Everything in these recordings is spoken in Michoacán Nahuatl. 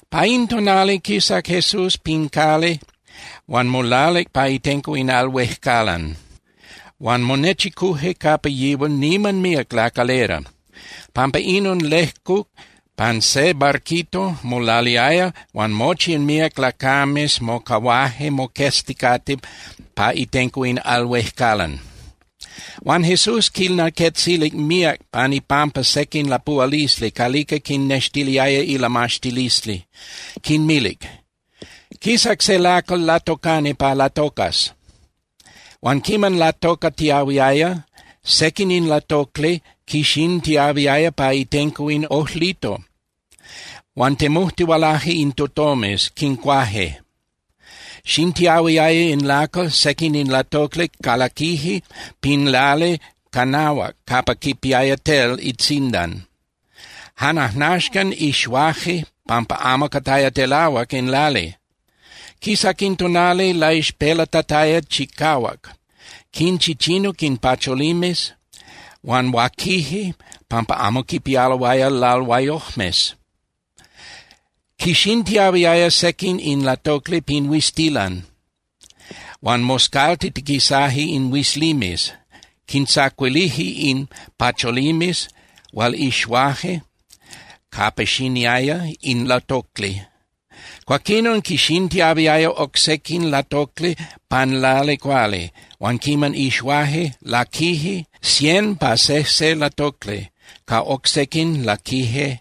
Pa in tonali quisac Jesús pin cali huan molalic pa itenco in al huejcalan. Huan monechicuje capa yihual niman míac lacalera. Pampa inon lejcuc pan se barquito, molaliaya, huan mochi in míac lacames mocahuaje moquezticate pa itenco in al huejcalan. Huan Jesús quinlaquetzilic míac pan ipampa sequin lapuhualisli calica quinextiliaya ilamaxtilisli. Quinmilic: —Quisac se lacal latocani pa latocas. Huan quiman latocatiahuiaya, sequin in latocli quixintiahuiaya pa itenco in ojlito. Huan temujtihualaje in tutomes, quincuaje. Xintiahuiaya in lacal, sequin in latocli calaquije pin lali canahuac capa quipiaya tel itzindan. Jan ajnaxcan ixuaje pampa amo cataya telahuac in lali. Quisac in tonali laixpelatataya chicahuac. Quinchichinuc in pacholimes huan huaquije pampa amo quipialoaya lalhuayojmes. Quixintiahuiaya sequin in latocli pin huiztilan, huan moscaltitiquisaje in huizlimes, quintzacuilije in pacholimes hual ixuaje capa xiniaya in latocli. Cuaquinon, quixintiahuiaya oc sequin latocli pan lali cuali, huan quiman ixuaje, laquije cien pa sejse latocli, ca oc sequin laquije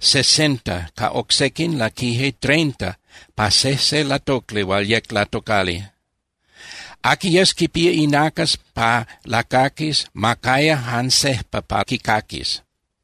sesenta, ca oc sequin laquije treinta pa sejse latocli hual yec latocali. Aqui yes quipía inacas pa lacaquis, ma caya jan sejpa pa quicaquis.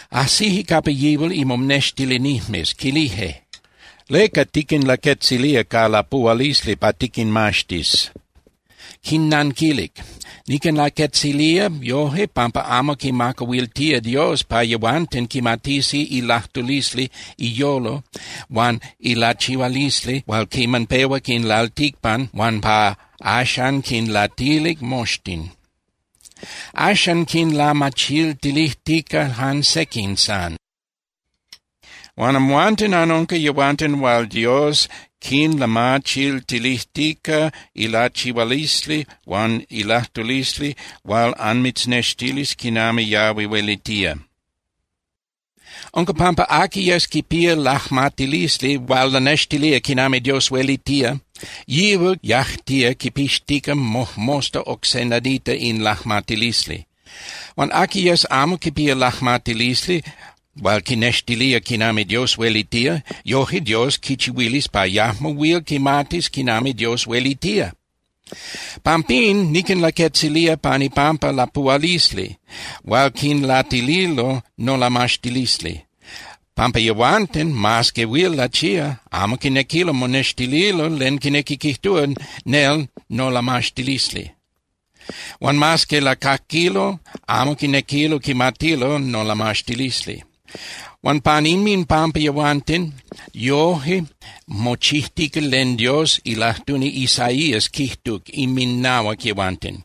Ajsije capa yihual imonextilinijmes, quilije: —¿Leca tiquinlaquetzilía ca lapuhualisli pa tiquinmaxtis? Quinnanquilic: —Niquinlaquetzilía yoje pampa amo quimacahuiltía Dios pa yehuanten quimatisi ilajtulisli iyolo huan ilachihualisli hual quiman pehuac in lalticpan huan pa axan quinlatilic moxtin. Axan quinlamachiltilijtica jan sequin san. Huan amhuanten anunca yehuanten hual Dios quinlamachiltilijtica ilachihualisli huan ilajtulisli hual anmitznextilis quinami yahui huelitía. Unca pampa aqui yes quipía lajmatilisli hual lanextilía quinami Dios huelitía, yihual yajtía quipixtica mojmosta oc se nadita in lajmatilisli. Huan aqui yes amo quipía lajmatilisli hual quinextilía quinami Dios huelitía, yoje Dios quichihuilis pa yajmo huil quimatis quinami Dios huelitía. Pampín niquinlaquetzilía pan ipampa lapuhualisli hual quinlatililo nolamaxtilisli, pampa yehuanten, mas que huil lachía, amo quinequilo monextililo len quinequi quijtúa nel nolamaxtilisli. Huan mas que lacaquilo amo quinequilo quimatilo nolamaxtilisli. Huan pan inminpampa yehuanten, yoje mochijtica len Dios ilajtuni Isaías quijtuc inminahuac yehuanten.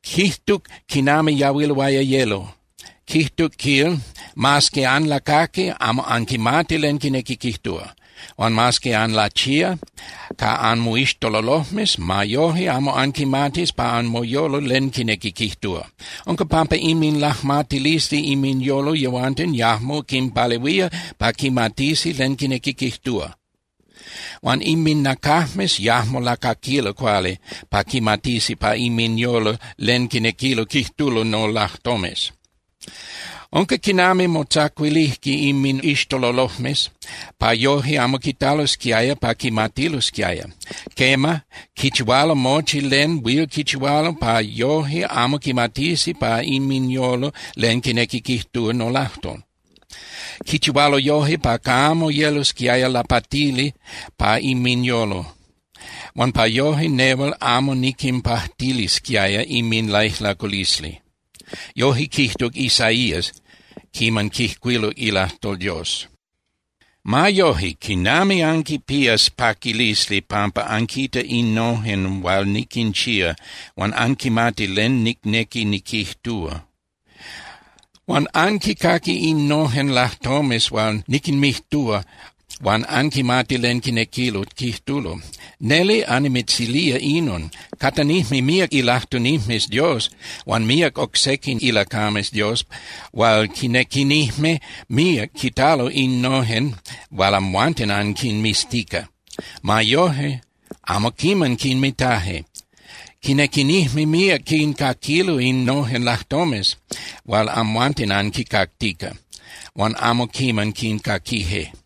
Quijtuc quinami yahuiloaya yelo, quijtuc, quil: Mas que anlacaqui, amo anquimati len quinequi quijtúa. Huan mas que anlachía ca anmoixtololojmes, ma yoje amo anquimatis pa anmoyolo len quinequi quijtúa. Unca pampa inminlajmatilisli inminyolo yehuanten yajmo quinpalehuía pa quimatisi len quinequi quijtúa. Huan inminacajmes yajmo lacaquilo cuali pa quimatisi pa inminyolo len quinequilo quijtulo nolajtomes. Unca quinami motzacuilijque inmixtololojmes pa yoje amo quitalosquiaya pa quimatilosquiaya. Quema, quichihualo mochi len huil quichihualo pa yoje amo quimatisi pa inminyolo len quinequi quijtúa nolajtol. Quichihualo yoje pa camo yelosquiaya lapatili pa inminyolo, huan pa yoje nehual amo niquinpajtilisquiaya inminlaijlaculisli. Yoje quijtuc Isaías quiman quijcuiluc ilajtol Dios. ’Ma yoje, ¡quinami anquipías paquilisli pampa anquita innojen hual niquinchía huan anquimati len nicnequi niquijtúa! Huan anquicaqui innojen lajtomes hual niquinmijtúa huan anquimati len quinequilo quijtulo. Neli annimitzilía inon. Catanijme míac ilajtunijmes Dios huan míac oc sequin ilacames Dios hual quinequinijme míac quitalo innojen hual amhuanten anquinmiztica. Ma yoje, amo quiman quinmitaje. Quinequinijme míac quincaquilo innojen lajtomes hual amhuanten anquincactica, huan amo quiman quincaquije.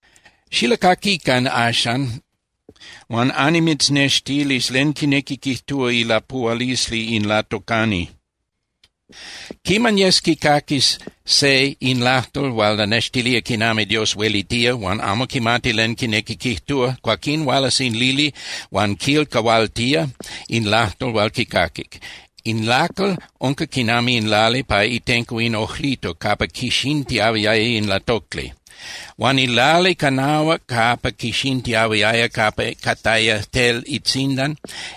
’Xilacaquican axan, huan annimitznextilis len quinequi quijtúa ilapuhualisli in latocani. Quiman yes quicaquis se in lajtol hual lanextilía quinami Dios huelitía, huan amo quimati len quinequi quijtúa, cuaquín hualas in lili huan quilcahualtía in lajtol hual quicaquic. In lacal unca quinami in lali pa itenco in ojlito capa quixintiahuiaya in latocli. Huan in lali canahuac capa quixintiahuiaya capa cataya tel itzindan,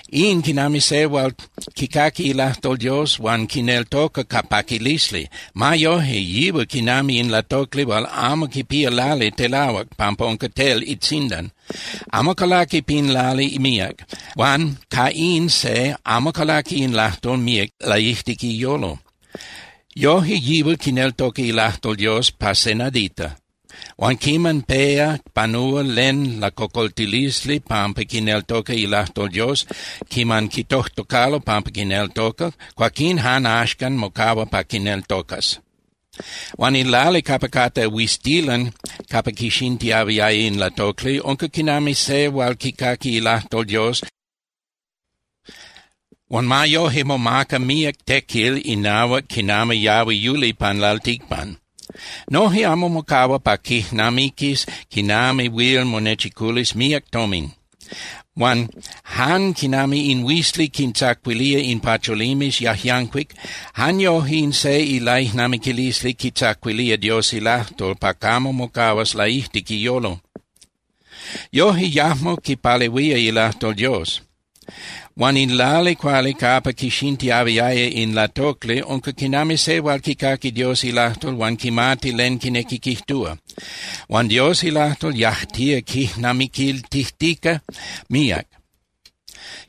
in quinami se hual quicaqui ilajtol Dios huan quineltoca ca paquilisli. Ma yoje, yihual quinami in latocli hual amo quipía lali telahuac pampa unca tel itzindan. Amo calaqui pin lali míac, huan ca in se amo calaqui in lajtol míac laijtic iyolo. Yoje, yihual quineltoca ilajtol Dios pa se nadita. Huan quiman péa panúa len lacocoltilisli pampa quineltoca ilajtol Dios, quiman quitojtocalo pampa quineltoca, cuaquín jan axcan mocahua pa quineltocas. Huan in lali capa catá huiztilan capa quixintiahuiaya in latocli unca quinami se hual quicaqui ilajtol Dios, huan ma yoje momaca míac tequil inahuac quinami yahui yuli pan lalticpan. Noje amo mocahua pa quijnamiquis quinami huil monechiculis míac tomin. Huan jan quinami in huizli quintzacuilía in pacholimes yajyancuic, jan yoje in se ilaijnamiquilisli quitzacuilía Dios ilajtol pa camo mocahuas laijtic iyolo. Yoje yajmo quipalehuía ilajtol Dios. Huan in lali cuali capa quixintiahuiaya in latocli unca quinami se hual quicaqui Dios ilajtol huan quimati len quinequi quijtúa. Huan Dios ilajtol yajtía quijnamiquiltijtica míac.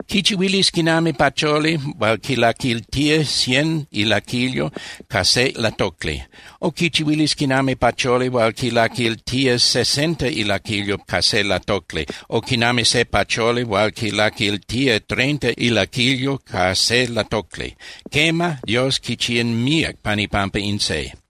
Quichihuilis quinami pacholi hual quilaquiltía cien ilaquilyo ca se latocli. O quichihuilis quinami pacholi hual quilaquiltía sesenta ilaquilyo ca se latocli o quinami se pacholi hual quilaquiltía treinta ilaquilyo ca se latocli. Quema, Dios quichía míac pan ipampa in se.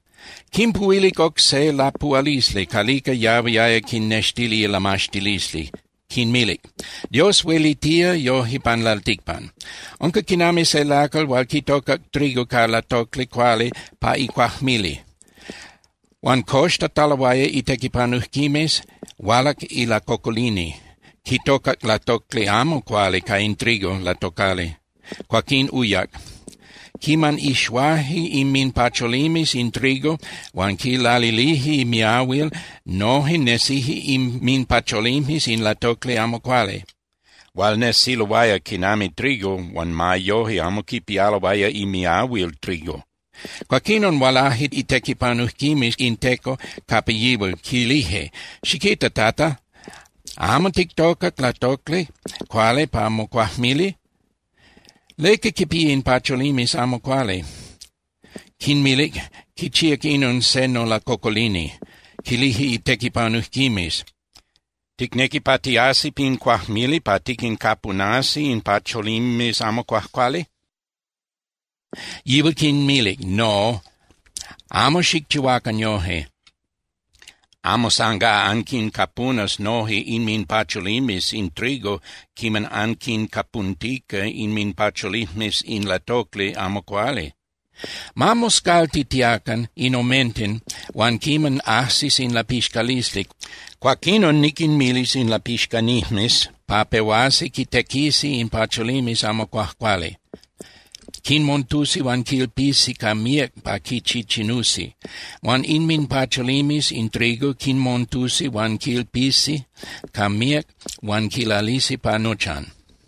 Quinpuhuilic oc se lapuhualisli calica yahuiaya quinnextili ilamaxtilisli, quinmilic: —Dios huelitía yoje pan lalticpan. Unca quinami se lacal hual quitocac trigo ca latocli cuali pa icuajmili. Huan coxtataloaya itequipanujquimes, hualac ilacocolini, quitocac latocli amo cuali ca in trigo latocali, cuaquín uyac. Quiman ixuaje inminpacholimes in trigo huan quilalilije miahuil, noje nesije inminpacholimes in latocli amo cuali, hual nesiloaya quinami trigo huan ma yoje amo quipialoaya imiahuil trigo. Cuaquín hualaje itequipanujquimes in teco capa yihual, quilije: “Xiquita, Tata, ¿amo tictocac latocli cuali pa mocuajmili? ¿Leca quipía in pacholimes amo cuali?” Quinmilic: “Quichíac inon se nolacocolini.” Quilije itequipanujquimes: “¿Ticnequi pa tiasi pin cuajmili pa tiquincapunasi in pacholimes amo cuajcuali?” Yihual quinmilic: “No, amo xicchihuacan yoje, amo sangá anquincapunas noje inminpacholimes in trigo quiman anquincapuntica inminpacholijmes in latocli amo cuali. Ma moscaltitiacan in omenten huan quiman ajsis in lapixcalisli, cuaquinon niquinmilis in lapixcanijmes pa pehuasi quitequisi in pacholimes amo cuajcuali. Quinmontusi huan quilpisi ca míac pa quichichinusi. Huan inminpacholimes in trigo quinmontusi huan quilpisi ca míac huan quilalisi pa nochan.”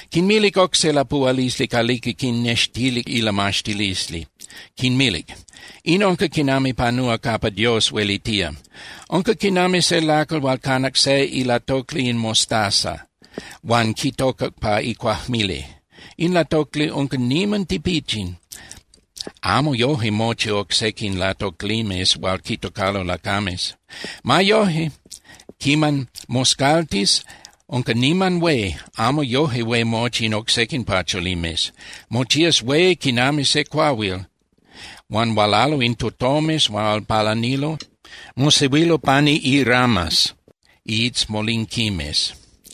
Quinmilic oc se lapuhualisli calica quinnextilic ilamaxtilisli, quinmilic: —In unca quinami panúa capa Dios huelitía. Unca quinami se lacal hual canac se ilatocli in mostaza huan quitocac pa icuajmili. In latocli unca niman tipichin, amo yoje mochi oc sequin latoclimes hual quitocalo lacames. Ma yoje, quiman moscaltis, unca niman hué, amo yoje hué mochi in oc sequin pacholimes. Mochías hué quinami se cuahuil, huan hualalo in tutomes hual palanilo, mosehuilo pani iramas (iitzmolinquimes).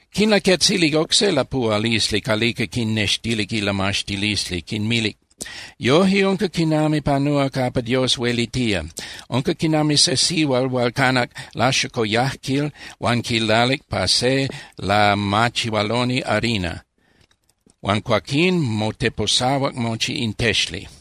Quinlaquetzilic oc se lapuhualisli calica quinnextilic ilamaxtilisli, quinmilic: —Yoje unca quinami panúa capa Dios huelitía. Unca quinami se sihual hual canac laxocoyajquil huan quilalic pa se lamachihualoni harina, huan cuaquín moteposahuac mochi in texli.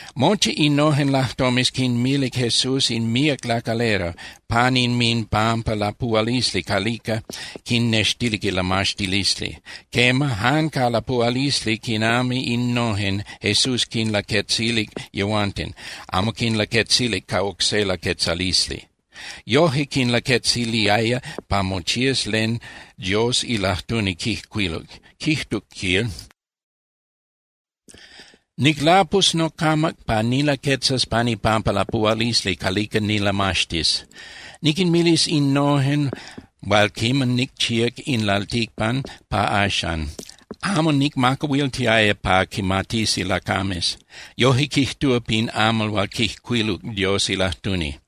Mochi innojen lajtomes quinmilic Jesús in míac lacalera pan inminpampa lapuhualisli calica quinnextilic ilamaxtilisli. Quema, jan ca lapuhualisli quinami innojen Jesús quinlaquetzilic yehuanten, amo quinlaquetzilic ca oc se laquetzalisli. Yoje quinlaquetziliaya pa mochías len Dios ilajtuni quijcuiluc, quijtuc, quil: Niclapus nocamac pa nilaquetzas pan ipampa lapuhualisli calica nilamaxtis. Niquinmilis innojen hual quiman nicchíac in lalticpan pa axan, amo nicmacahuiltiaya pa quimatisi lacames. Yoje quijtúa pin amal hual quijcuiluc Dios ilajtuni.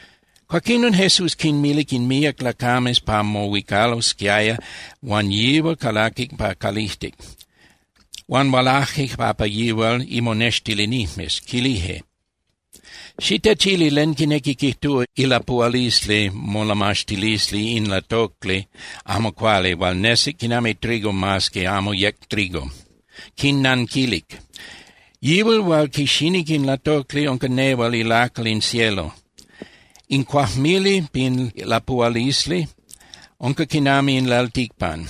Cuaquinon Jesús quinmilic in míac lacames pa mohuicalosquiaya huan yihual calaquic pa calijtic. Huan hualaje capa yihual imonextilinijmes, quilije: —Xitechili len quinequi quijtúa ilapuhualisli molamaxtilisli in latocli amo cuali hual nesic quinami trigo mas que amo yec trigo. Quinnanquilic: —Yihual hual quixinic in latocli unca nehual ilacal in cielo. In cuajmili pin lapuhualisli unca quinami in lalticpan.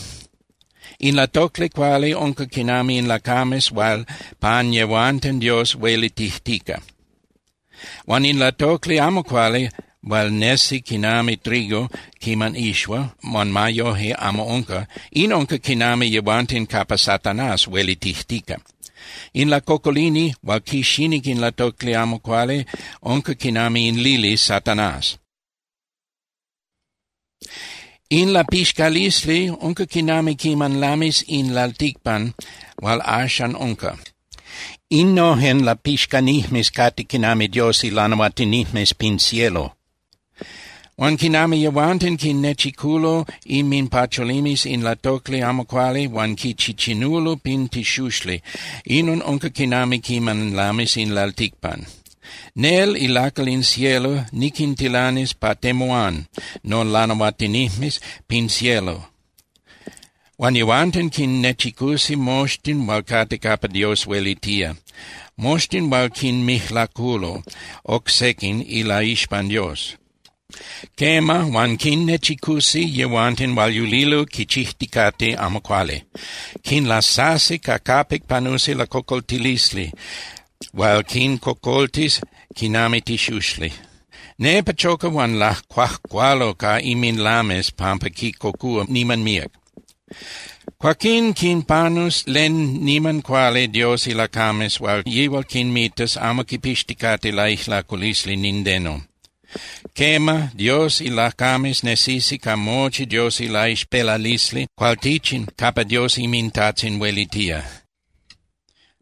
In latocli cuali unca quinami in lacames hual pan yehuanten Dios huelitijtica. Huan in latocli amo cuali hual nesi quinami trigo quiman ixua, huan ma yoje amo unca, in unca quinami yehuanten capa Satanás huelitijtica. In lacocolini hual quixinic in latocli amo cuali unca quinami in lili Satanás. In lapixcalisli unca quinami quiman lamis in lalticpan hual axan unca. Innojen lapixcanijmes cate quinami Dios ilanahuatinijmes pin cielo. Huan quinami yehuanten quinnechiculo inminpacholimes in latocli amo cuali huan quichichinulo pin tixuxli, inon unca quinami quiman lamis in lalticpan. Nel ilacal in cielo niquintilanis pa temuán nolanahuatinijmes pin cielo. Huan yehuanten quinnechicusi moxtin hual cate capa Dios huelitía, moxtin hual quinmijlaculo oc sequin ilaixpan Dios. Quema, huan quinnechicusi yehuanten hual yulilo quichijticate amo cuali. Quinlasasi ca capic panusi lacocoltilisli hual quincocoltis quinami tixuxli. Nepa choca huan lacuajcualo ca inminlames pampa quincocúa niman míac. Cuaquín quinpanus len niman cuali Dios ilacames hual yihual quinmitas amo quipixticate laijlaculisli nindeno. Quema, Dios ilacames nesisi ca mochi Dios ilaixpelalisli cualtichin capa Dios inminTajtzin huelitía.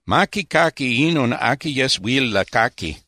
¡Ma quicaqui inon aqui yes huil lacaqui!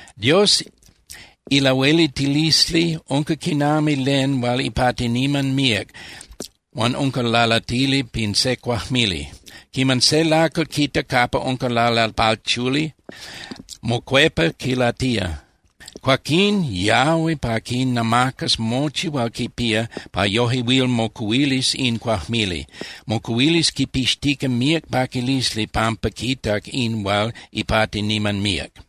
’Dios ilahueliltilisli unca quinami len hual ipati niman míac huan unca lalatili pin se cuajmili. Quiman se lacal quita capa unca lalalpachuli, mocuepa quilatía. Cuaquín yahui pa quinamacas mochi hual quipía pa yoje huil mocuhuilis in cuajmili. Mocuhuilis quipixtica míac paquilisli pampa quitac in hual ipati niman míac.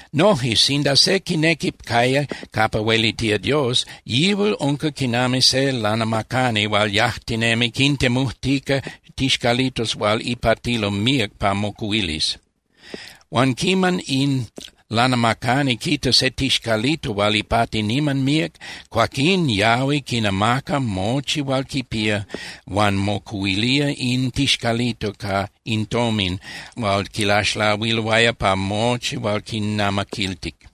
’Noje, sinda se quinequi caya capa huelitía Dios, yihual unca quinami se lanamacani hual yajtinemi quintemujtica tixcalitos hual ipatilo míac pa mocuhuilis. Huan quiman in lanamacani quita se tixcalito hual ipati niman míac, cuaquín yahui, quinamaca mochi hual quipía huan mocuhuilía in tixcalito ca in tomin hual quilaxlahuiloaya pa mochi hual quinnamaquiltic.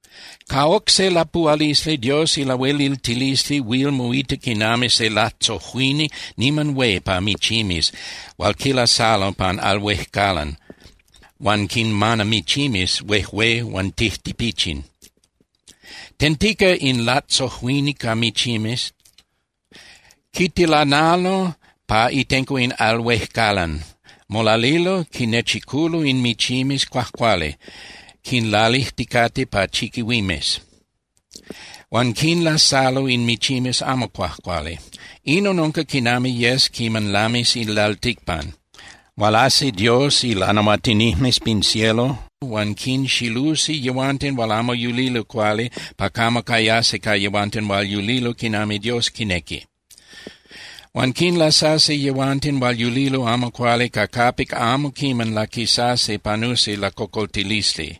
’Ca oc se lapuhualisli, Dios ilahueliltilisli huil moita quinami se latzojuini niman hué pa michimes hual quilasalo pan al huéjcalan huan quinmana michimes huejué huan tijtipichin. Tentica in latzojuini ca michimes, quitilanalo pa itenco in al huejcalan. Molalilo, quinnechiculo in michimes cuajcuali, quinlalijticate pa chiquihuimes. Huan quinlasalo in michimes amo cuajcuali. Inon unca quinami yes quiman lamis in lalticpan. Hualasi Dios ilanahuatinijmes pin cielo huan quinxilusi yehuanten hual amo yulilo cuali pa camo cayasi ca yehuanten hual yulilo quinami Dios quinequi. Huan quinlasasi yehuanten hual yulilo amo cuali ca capic amo quiman laquisasi panusi lacocoltilisli,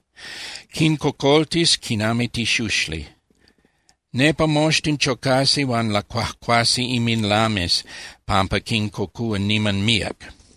quincocoltis quinami tixuxli. Nepa moxtin chocasi huan lacuajcuasi inminlames pampa quincocúa niman míac.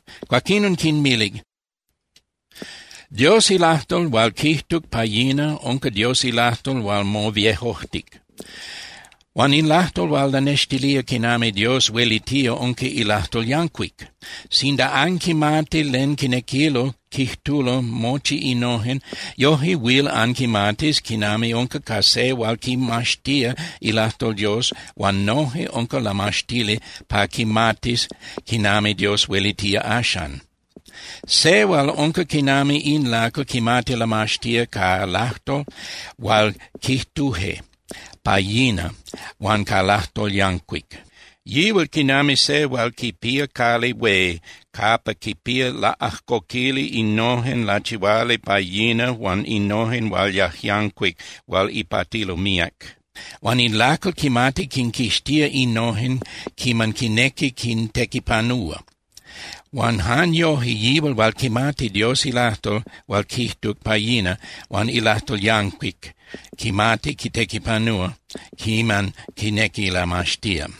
Cuaquinon quinmilic: —Dios ilajtol hual quijtuc pa yina unca Dios ilajtol hual moviejojtic. Huan in lajtol hual lanextilía quinami Dios huelitía unca ilajtol yancuic. Sinda anquimati len quinequilo quijtulo mochi innojen, yoje huil anquimatis quinami unca ca se hual quimaxtía ilajtol Dios huan noje unca lamaxtili pa quimatis quinami Dios huelitía axan. Se hual unca quinami in lacal quimati lamaxtía ca lajtol hual quijtuje pa yina huan ca lajtol yancuic. Yihual quinami se hual quipía cali hué capa quipía laꞌajcoquili innojen lachihuali pa yina huan innojen hual yajyancuic hual ipatilo míac. Huan in lacal quimati quinquixtía innojen quiman quinequi quintequipanúa. Huan jan yoje yihual hual quimati Dios ilajtol hual quijtuc pa yina huan ilajtol yancuic quimati quitequipanúa quiman quinequi lamaxtía.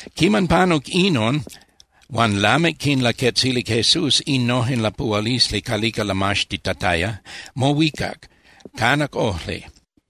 Quiman panuc inon huan lamic quinlaquetzilic Jesús innojen lapuhualisli calica lamaxtitataya, mohuicac, canac ojli.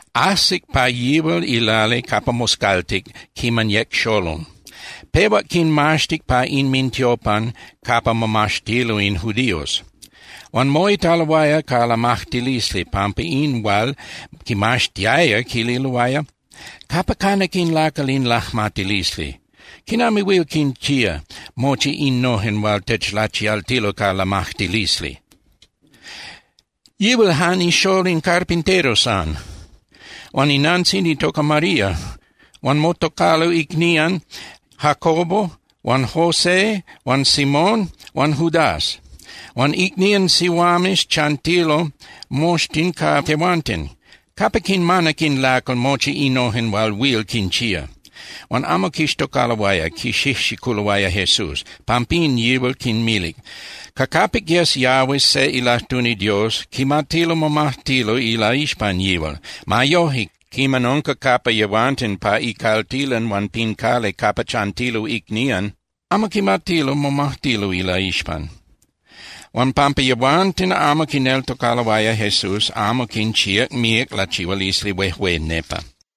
Ajsic pa yihual ilali capa moscaltic quiman yec xolol. Pehuac quinmaxtic pa inmintiopan capa momaxtilo in judíos. Huan moitaloaya ca lamajtilisli pampa in hual quimaxtiaya, quililoaya: —¿Capa canac in lacal in lajmatilisli? ¿Quinami huil quinchía mochi innojen hual techlachialtilo ca lamajtilisli? Yihual jan ixól in carpintero san. Huan inantzin itoca María, huan motocalo icnían Santiago huan José huan Simón huan Judas. Huan icnían sihuames chantilo moxtin ca tehuanten. ¿Capa quinmanac in lacal mochi innojen hual huil quinchía? Huan amo quixtocaloaya, quixijxiculoaya Jesús. Pampín yihual quinmilic: —Ca capic yes yahuis se ilajtuni Dios, quimatilo momajtilo ilaixpan yihual. Ma yoje, quiman unca capa yehuanten pa icaltilan huan pin cali capa chantilo icnían, amo quimatilo momajtilo ilaixpan. Huan pampa yehuanten amo quineltocaloaya, Jesús amo quinchíac míac lachihualisli huejué nepa.